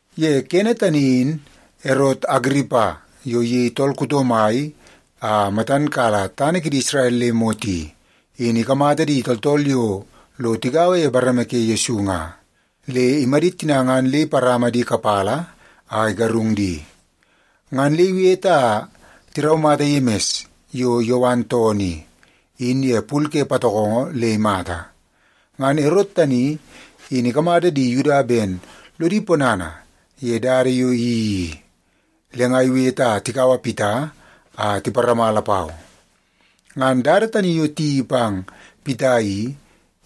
Ye kene tani in Erot Agiripa yo iyei tool kuto mai a matan kala tana kidi Isrel le imot i, in ikamata di tooltool yo lo tigaua ye bareme ke Yesu nga, le imadit tina ngan le iparama di kapala a igarung di. Ngan le iwete a tiraumata Yemis yo Yowan toonoo i, in ye pul ke patokongo le imata. Ngan Erot tani in ikamata di Yuda ben lodi ponana ye dada yo iyeii i, le nga iwete a tikaua Pita a tiparama lapau. Ngan dada tani yo tiyeii pang Pita i,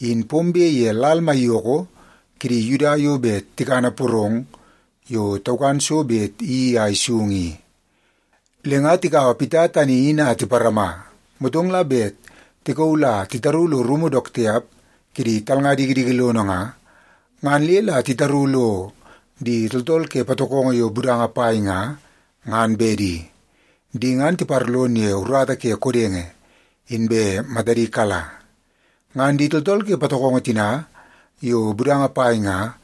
in pombe ye lal maiyoko kidi Yuda yo bet tikana porong yo taukan so bet iyeii a isung i. Le nga tikaua Pita tani in a tiparama, motong la bet tikauu la titaru lo rumu dook tiap kidi talnga dikidiki lono nga, ngan le la itaru lo di tooltool ke patokongo yo budanga pai nga, ngan bedi. Di ngan tiparlon ye urata ke kodenge, inbe matadi kala. Ngan di tooltool ke patokongo tina yo budanga pai nga,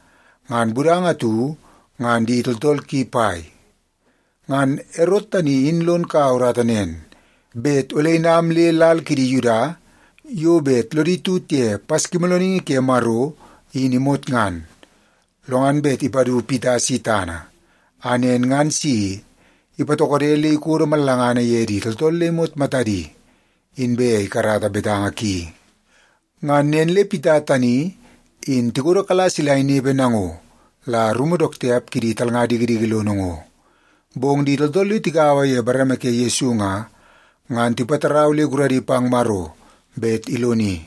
ngan budanga atu ngan di tooltool ki pai. Ngan Erot tani in lon kaua urata nen, bet ole inam le lal kidi Yuda yo bet lodi tut ye Paskimoolooningi ke Maro in imot ngan, lo ngan bet ipadu Pita si tana, a nen ngan si ipatokode le ikodo mallangana ye di tooltool le imot matadi, inbe ikarata betanga ki. Ngan nen le Pita tani in tikodokala sila inepe nango la rumu dook tiap kidi talnga dikidiki lono ngo. Bong di tooltool yo tigaua ye bareme ke Yesu nga, ngan tipatarau le guradi pang Maro bet iloni.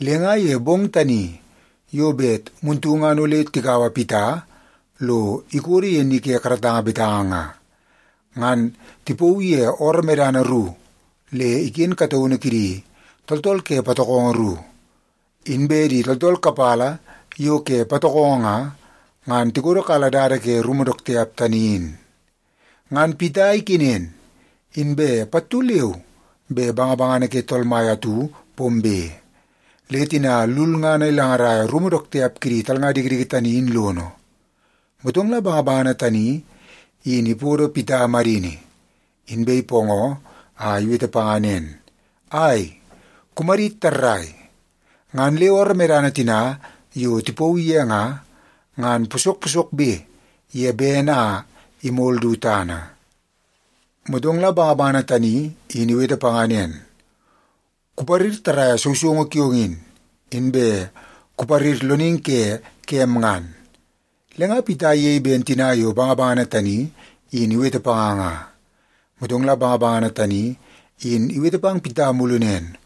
Le nga ye bong tani yo bet muntu ngan ole tikaua Pita lo ikodo ye ni ke karatanga betanga nga, ngan tipauu ye ooroo medana ru le iken kataunu kidi tooltool ke patokongo ru. Inbe di tooltool kapala yo ke patokongo nga, ngan tikodokala dada ke rumu dook tiap tani in. Ngan Pita ikenen, inbe pattu leu be bangabangana ke Tool Mai atu pombe, le tina lulngana ilangaraia rumu dook tiap kidi talnga dikidiki tani in lono. Motong la bangabangana tani in ipodo Pita madini, inbe ipoongoo a iwete panga nen, “Ai, kumadit tarrai.” Ngan le ooroo medana tina yo tipauu ye nga, ngan posok posokbe ye bene a imol du tana. Motong la bangabangana tani in iwete panga nen, “Kuparir tarraia sousoungu kiong in, inbe kuparir loningi ke kem ngan.” Le nga Pita iyei ben tina yo bangabangana tani in iwete panga nga. Motong la bangabangana tani in iwete pang Pita mulu nen,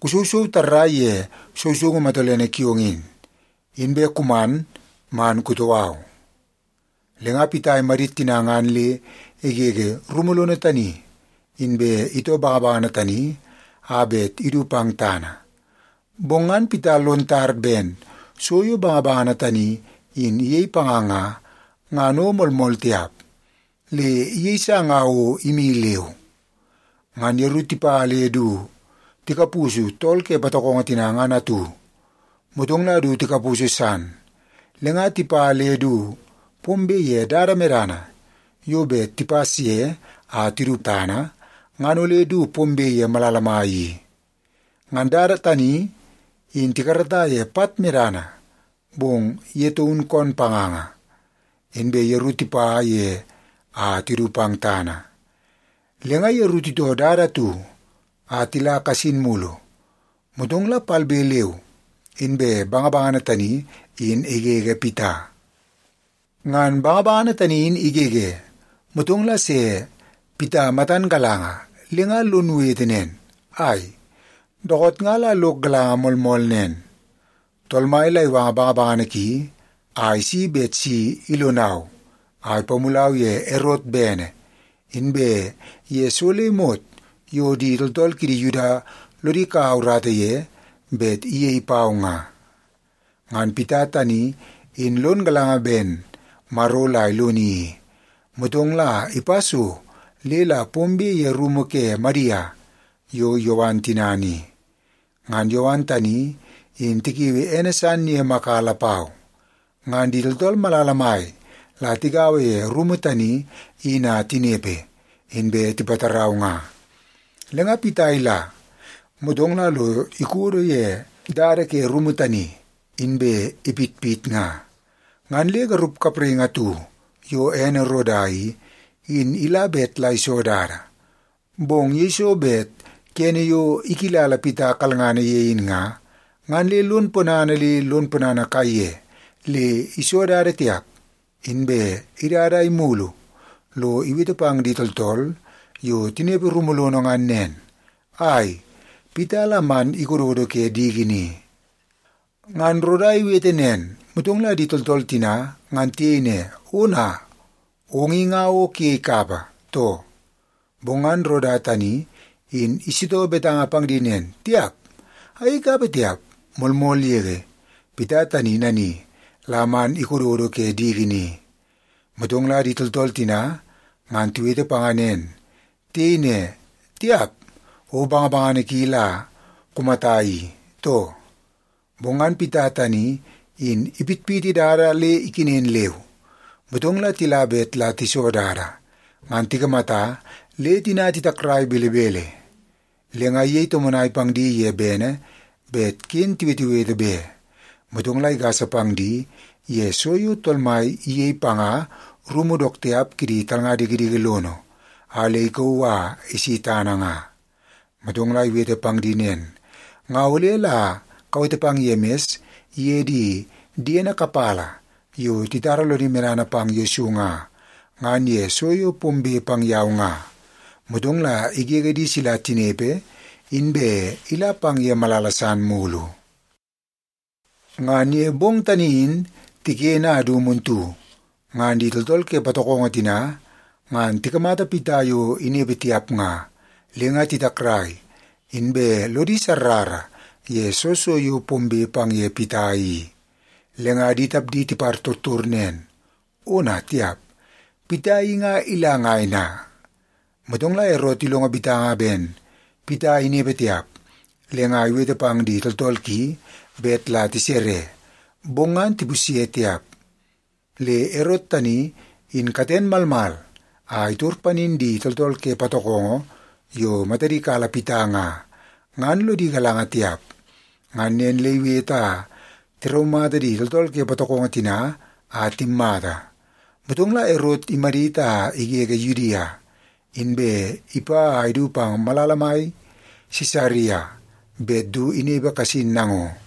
“Kusousou tarraia ye sousoungu matolene kiong in, inbe kuman man kutoo au.” Le nga Pita imadit tina ngan le igege rumu lono tani, inbe itoo bangabangana tani a bet idu pang tana. Bong ngan Pita lon tar ben so yo bangabangana tani in iyei panga nga, ngan o moolmool tiap, le iyeisa nga o imi leu. Ngan yeru tipa le du tikapusu tool ke patokongo tina ngan atu, motong la du tikapusu san, le nga tipa le du pombe ye dada medana yo bet tipas ye a tidu tana, ngan ole du pombe ye malala mai i. Ngan dada tani in tikarata ye pat medana, bong ye taun koon panganga, inbe yeru tipa ye a tidu pang tana. Le nga yeru titoo dada atu a tila kasin mulu, motong la palbe leu inbe bangabangana tani in igege Pita. Ngan bangabangana tani in igege, motong la se Pita matan galanga le nga lon wete nen, “Ai, dookoot nga la lok galanga moolmool nen, Tool Mai la iwanga bangabangana ki a isi bet si ilonau a ipamulau ye Erot bene, inbe ye so le imot yo di tooltool kidi Yuda lodi kaua urata ye bet iyei pau nga.” Ngan Pita tani in lon galanga ben Maro la iloni i, motong la ipa so le la pombe ye rumu ke Madia yo Yowan tinana i. Ngan Yowan tani, in tikiui ene san ye Maka lapau. Ngan di tooltool malala mai la tigaua ye rumu tani in a tinepe, inbe tipatarau nga. Le nga Pita ila, motong la lo ikodo ye dada ke rumu tani, inbe ipitpit nga. Ngan le garup kapraingi atu yo ene Roda i, in ila bet la iso dada. Bong yeiso bet kene yo ikilala Pita kalngana ye in nga, ngan le lon ponana le lon ponana kaiye le iso dada tiap, inbe idada a imulu lo iwete pang di tooltool yo tinepe rumu lono ngan nen, “Ai, Pita la man ikododo ke diki ni.” Ngan Roda iwete nen, motong la di tooltool tina ngan tiyei ne, “Ona, ong i nga o kuyei kapa, too?” Bong ngan Roda tani in isitoo betanga pang di nen, “Tiap, ayei kapa tiap! Moolmool yege, Pita tani nani la man ikododo ke diki ni.” Motong la di tooltool tina ngan tiwete panga nen. Tiyei ne, “Tiap, o bangabangana ki la kumata i, too?” Bong ngan Pita tani in ipitpiti dada le ikenen leu. Motong la tila bet la tiso dada, ngan tikamata le tina titakrai belebele. Le nga iyei tomonai pang di ye bene bet ken tiwetewete be. Motong la igasa pang di ye so yo Tool Mai iyei panga rumu dook tiap kidi talnga dikidiki lono a le ikauu a isi tana nga. Motong la iwete pang di nen, “Nga ole la kawete pang Yemis iye di diene kapala yo titara lodi medana pang Yesu nga, ngan ye so yo pombe pang yau nga.” Motong la igege di sila tinepe, inbe ila pang ye malala san mulu. Ngan ye bong tani in tiken a du muntu, ngan di tooltool ke patokongo tina ngan tikamata Pita yo inepe tiap nga, le nga titakrai, inbe lodi sarrara ye soo so yo pombe pang ye Pita i. Le nga di tapdi tipartor nen, “Ona tiap, Pita i nga ila ngai na?” Motong la Erot ilongo betanga ben Pita inepe tiap, le nga iwete pang di tooltool ki bet la tisere, bong ngan tipusye tiap. Le Erot tani in katen malmal a itor panin di tooltool ke patokongo yo matadi kala Pita nga, ngan lodi galanga tiap. Ngan nen le iwete a tiraumata di tooltool ke patokongo tina a timmata. Motong la Erot imadit a igege Yudia, inbe ipa a idu pang malala mai Sisaria bet du inepe kasin nango.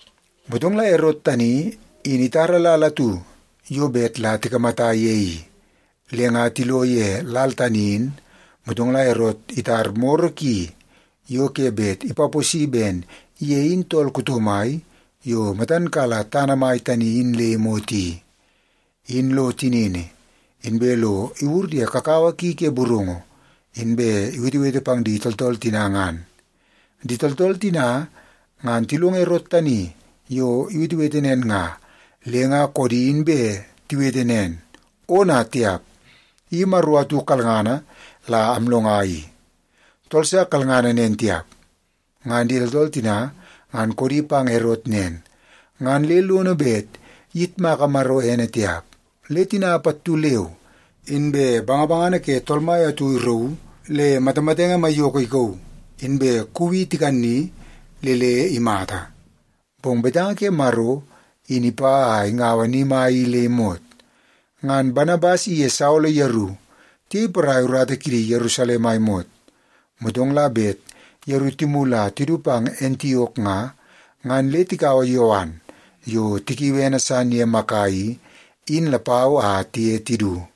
Motong la Erot tani in itara lal atu yo bet la tikamata ye i. Le nga tilo ye lal tani in, motong la Erot itar moro ki yo ke bet ipaposi ben ye in tool kuto mai yo matan kala tana mai tani in le imot i, in lo tinini, inbe lo iwur ye kakawa ki ke burungu, inbe iwetewete pang di tooltool tina ngan. Di tooltool tina ngan tilongo Erot tani yo iwetewete nen nga, le nga koodi inbe tiwete nen, “Ona tiap! I maro atu kalngana la amlonga i! Tool sa kalngana nen tiap!” Ngan di tooltool tina ngan koodi pang Erot nen, ngan le lono bet iyitmaka Maro ene tiap, le tina pattu leu inbe bangabangana ke Tool Mai atu irauu le matamatenge maiyoko ikauu, inbe kuuwi tikani le le imata. Bong betanga ke Maro in ipa a ingaua ni mai i le imot. Ngan Banabas iye Saolo yeru tiyei porai urata kidi Yerusalem a imot. Motong la bet yeru timulu a tidu pang Antiok nga, ngan le tikaua Yowan yo tikiui ene san ye Maka i, in lapau a tiye tidu.